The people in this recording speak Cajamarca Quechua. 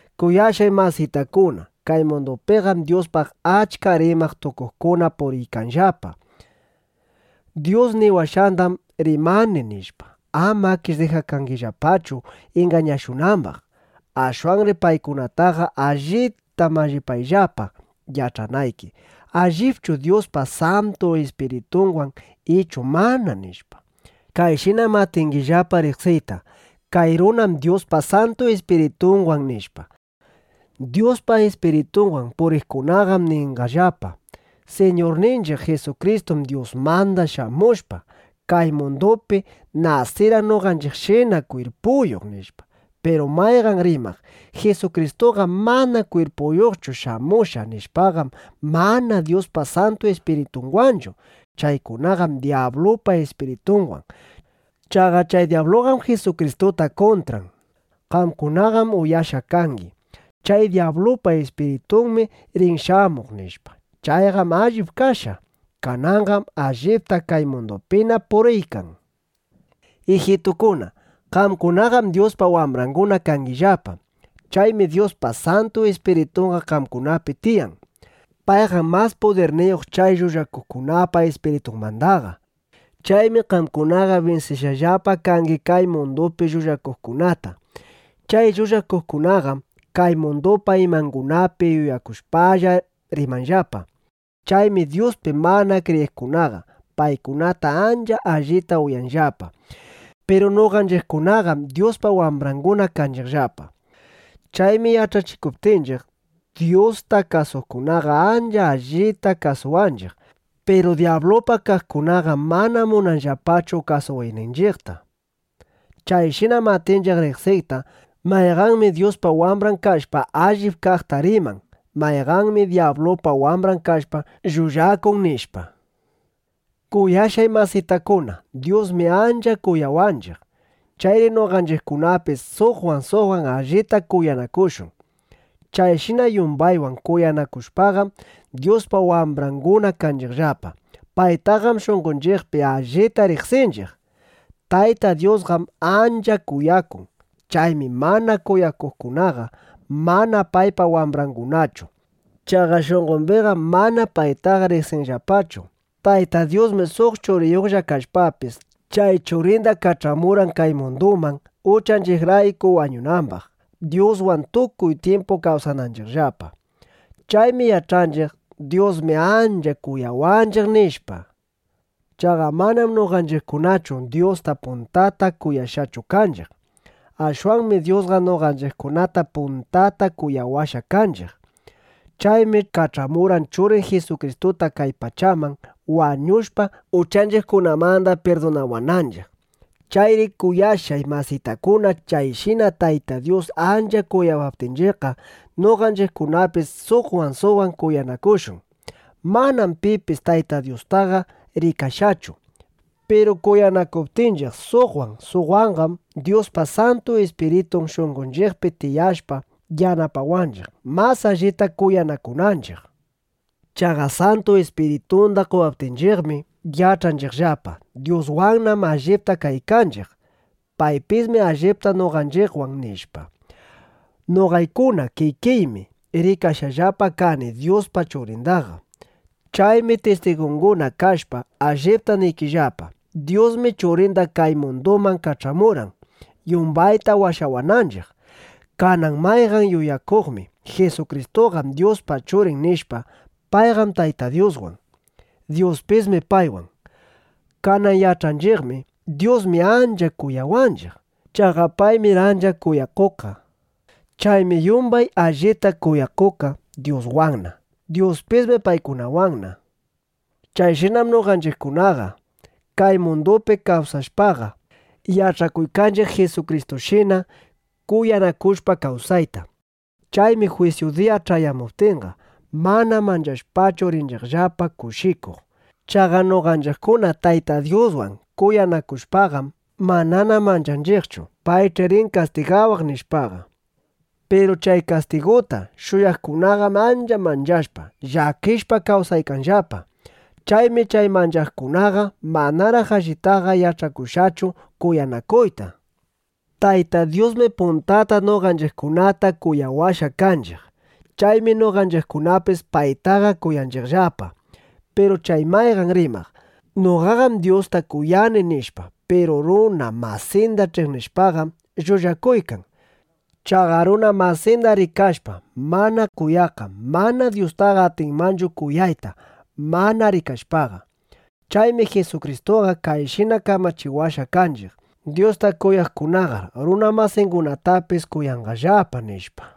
Kuyashqay masitakuna, kay mundupiqam Dyuspaq achka rimaq tukuqkuna puriykanllapa: “Dyus niwashqandam rimani” nishpa. Amakish dijakangillapachu ingañashunambaq. Ashwanri paykunataqa allita mallipayllapa yach'anayki: ¿Allipchu Dyuspa Santu Ispiritunwan ichu mana? nishpa. Kayshinam atingillapa riqsiyta: Kay runam Dyuspa Santu Ispiritunwan, nishpa. Dyuspa Ispiritunwan puriqkunaqam ninqallapa: “Siñurninchiq Jisukristum Dyusmanda shamushpa, kay mundupi nasirqan noqanchiqshina kwirpuyuq”, nishpa. Piru mayqan rimaq: “Jisukristuqam mana kwirpuyuqchu shamushqa”, nishpaqam, mana Dyuspa Santu Ispiritunwanchu. Chaykunaqam dyablupa ispiritunwan. Chaqa chay dyabluqam Jisukristuta kuntran. Qamkunaqam uyashqa kangi: “Chay dyablupa ispiritunmi rin shamuq” nishpa. Chayqam allip kashqa. Kananqam allipta kay mundupina puriykan. Ijitukuna, qamkunaqam Dyuspa wambranguna kangillapa. Chaymi Dyuspa Santu Ispiritunqa qamkunapi tiyan. Payqam mas pudirniyuq chay llullakuqkunapa ispiritunmandaqa. Chaymi qamkunaqa binsishqallapa kangi kay mundupi llullakuqkunata. Chay llullakuqkunaqam kay mundupa imangunapi yuyakushpalla rimanllapa. Chaymi Dyuspi mana kriyiqkunaqa paykunata ancha allita uyanllapa. Piru noqanchiqkunaqam Dyuspa wambranguna kanchiqllapa. Chaymi yach'achikuptinchiq, Dyusta kasuqkunaqa ancha allita kasuwanchiq. Piru dyablupa kaqkunaqam mana munanllapachu kasuwayninchiqta. Chayshinam atinchiq riqsiyta: Mayqanmi Dyuspa wambran kashpa, allip kaqta riman; mayqanmi dyablupa wambran kashpa, llullakun, nishpa. Kuyashqay masitakuna, Dyusmi ancha kuyawanchiq. Chayri noqanchiqkunapis suqwan suqwan allita kuyanakushun. Chayshina yumbaywan kuyanakushpaqam, Dyuspa wambranguna kanchiqllapa. Paytaqam shunqonchiqpi allita riqsinchiq. Tayta Dyusqam ancha kuyakun. Chaymi mana kuyakuqkunaqa mana paypa wambrangunachu. Chaqa shunqombiqam mana paytaqa riqsinllapachu. Tayta Dyusmi suq Churiyuqlla kashpapis, chay Churinda kach'amurqan kay munduman, uchanchiqrayku wañunambaq, Dyuswan tukuy tyimpu kawsananchiqllapa. Chaymi yach'anchiq: Dyusmi ancha kuyawanchiq, nishpa. Chaqa manam noqanchiqkunachu Dyusta puntata kuyashqachu kanchiq. Ashwanmi Dyusqa noqanchiqkunata puntata kuyawashqa kanchiq. Chaymi kach'amurqan Churin Jisukristuta kay pachaman, wañushpa, uchanchiqkunamanda pirdunawananchiq. Chayri kuyashqay masitakuna, chayshina Tayta Dyus ancha kuyawaptinchiqqa, noqanchiqkunapis suqwan suqwan kuyanakushun. Manam pipis Tayta Dyustaqa rikashqachu. Piru kuyanakuptinchiq suqwan, suqwanqam, Dyuspa Santu Ispiritun shunqonchiqpi tiyashpa yanapawanchiq, mas allita kuyanakunanchiq. Chaqa Santu Ispiritunda qowaptinchiqmi, yach'anchiqllapa: Dyuswannam allipta kaykanchiq. Paypismi allipta noqanchiqwan, nishpa. Noqaykuna kikiymi rikashqallapa kani Dyuspa Churindaqa. Chaymi tistigunguna kashpa, allipta niykillapa: Dyusmi Churinda kay munduman kach'amurqan, yumbayta washawananchiq. Kanan mayqan yuyakuqmi: “Jisukristuqam Dyuspa Churin” nishpa, payqam Tayta Dyuswan. Dyuspismi paywan. Kanan yach'anchiqmi: Dyusmi ancha kuyawanchiq. Chaqa paymir ancha kuyakuqqa. Chaymi yumbay allita kuyakuqqa Dyuswanna. Dyuspismi paykunawanna. Chayshinam noqanchiqkunaqa kay mundupi kawsashpaqa, yach'akuykanchiq Jisukristushina kuyanakushpa kawsayta. Chaymi jwisyu diya ch'ayamuptinqa, mana manchashpachu rinchiqllapa kushikuq. Chaqa noqanchiqkuna Tayta Dyuswan kuyanakushpaqam, manana manchanchiqchu: Paych'i rin kastigawaq, nishpaqa. Piru chay kastiguta shuyaqkunaqam ancha manchashpa, llakishpa kawsaykanllapa. Chaymi chay manchaqkunaqa manaraq allitaqa yach'akushqachu kuyanakuyta. Tayta Dyusmi puntata noqanchiqkunata kuyawashqa kanchiq. Chaymi noqanchiqkunapis paytaqa kuyanchiqllapa. Piru chay mayqan rimaq: “Noqaqam Dyusta kuyani” nishpa, piru runa masinda ch'iqnishpaqam, llullakuykan. Chaqa runa masinda rikashpa mana kuyaqqam mana Dyustaqa atinmanchu kuyayta mana rikashpaqa. Chaymi Jisukristuqa kayshina kamachiwashqa kanchiq: “Dyusta kuyaqkunaqar runa masingunatapis kuyanqallapa”, nishpa.